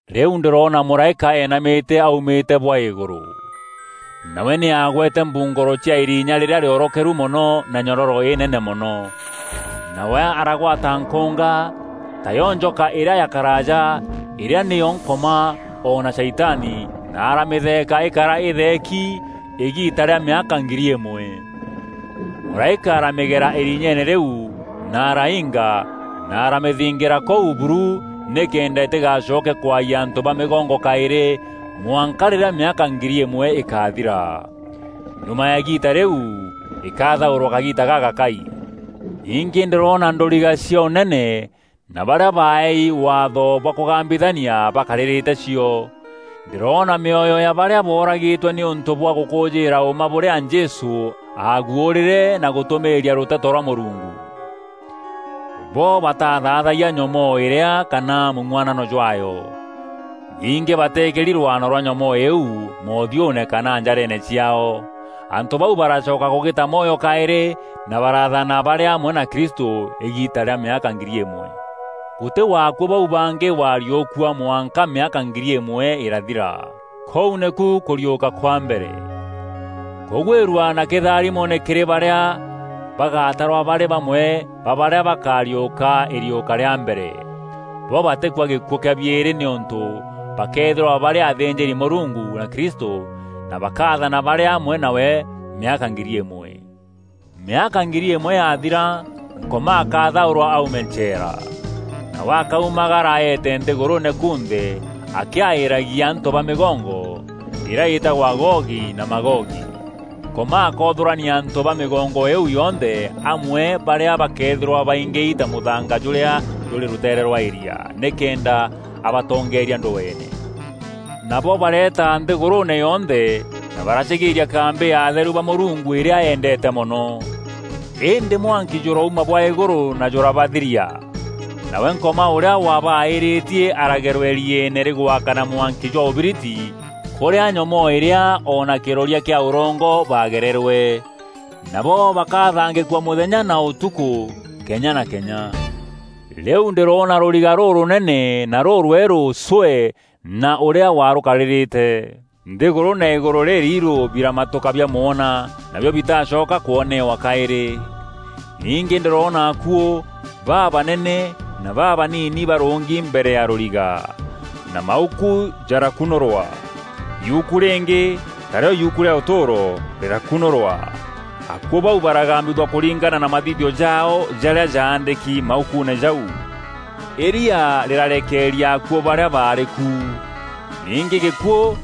Rîu ndîroona mûraîka eenamîte aumîte bwa îgûrû. Nawe nî aagwete mbungûro cia îrinya rîrîa rîorokeru mono na nyororo înene mono. Nawe aragwata nkûnga, tayo njoka îrîa ya karaaja îrîa nîyo Nkoma o na Shaitani na aramîtheeka îkara îtheeki îgiita rîa mîaka ngiri îmwe. Mûraîka aramîgera îrinyeene rîu na araiinga na aramîthingîra kûu buru nîkenda îtîgacoke kwayia antû ba mîgongo kaîrî, mwanka rîrîa mîaka ngiri îmwe îkathira. Nyuma ya îgiita rîu, îkathaûrwa kagiita gagakai. Ningî ndîroona ndûriga cia ûnene na barîa baaeei waatho bwa kûgambithania bakarîrîte cio. Ndîroona mîoyo ya barîa booragîtwe nîûntû bwa gûkûûjîîra ûûma bûrîa Jesû aaguûrîre na gûtûmîîria rûteto rwa Mûrungu. Bo batathaathayia nyomoo îrîa kana mûng'uanano jwaayo. Ningî bateekîri rwaano rwa nyomoo îîu moothiûûne kana njareene ciaao. Antû bau baracoka kûgîta mwoyo kaîrî na baraathana barî amwe na Kristû îgiita rîa mîaka ngiri îmwe. Gûtî wa akuû bau bangî wariûkua mwanka mîaka ngiri îmwe îrathira. Kûu nîku kûriûka kwa mbere. Kûgwîrua na kîtharimo nî kîrî barîa bagatarwa barî bamwe ba barîa bakariûka îriûka rîa mbere. Bo batîkua gîkuû kîa biîrî nîûntû bakeethîrwa barî athînjîri-Mûrungu na Kristû na bakaathana barî amwe nawe mîaka ngiri îmwe. Mîaka ngiri îmwe yathira, Nkoma akathaûrwa aume ncheera. Nawe akaumagara eete nthîgûrûûne kunthe akîaîîragia antû ba mîgongo, îrîa îtagwa Gogi na Magogi. Nkoma akoothûrania antû ba mîgongo îîu yonthe amwe barîa bakeethîrwa baingîi ta mûthanga jûrîa jûrî rûteere rwa îrîa, nîkenda abatongeeria ndweene. Nabo bareeta nthîgûrûûne yonthe na baracîgîîria kambî ya atheru ba Mûrungu îrîa eendeete mono. Îndî mwanki jûrauma bwa îgûrû na jûrabathiria. Nawe Nkoma ûrîa wabaîîrîtie aragerwa îrieene rîgwakana mwanki ja ûbiriti kûrîa nyomoo îrîa o na kîroria kîa ûrongo baagererwe. Nabo bakathangîkua mûthenya na ûtukû kenya na kenya. Rîu ndîroona rûriga rûrûnene na rûrwerû cwee na ûrîa warûkarîrîte. Nthîgûrû na îgûrû rîriirû biramatûka biamwona, nabio bitacoka kwoneewa kaîrî. Ningî ndîroona akuû, babanene na babanini barûngi mbere ya rûriga, na mauku jarakunûrwa. Yuku rîngî, taarîo yuuku rîa ûtûûro, rîrakunûrwa. Akuû bau baragambithua kûringana na mathithio jaao jarîa jaandîki maukuune jau. Îria rîrarekeeria akuû barîa baarî ku. Ningî gîkuû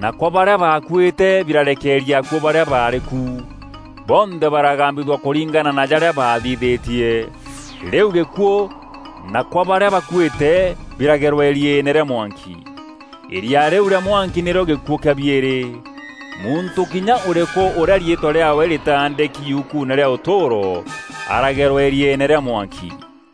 na kwa barîa bakuîte birarekeeria akuû barîa baarî ku. Bonthe baragambithua kûringana na jarîa baathithîtie. Rîu gîkuû na kwa barîa bakuîte biragerwa îrieene rîa mwanki. Îria rîu rîa mwanki nîrîo gîkuû kîa biîrî. Muntû kinya ûrîkû ûrîa riîtwa rîaawe rîtaandîki yukuune rîa ûtûûro, aragerwa îrieene rîa mwanki.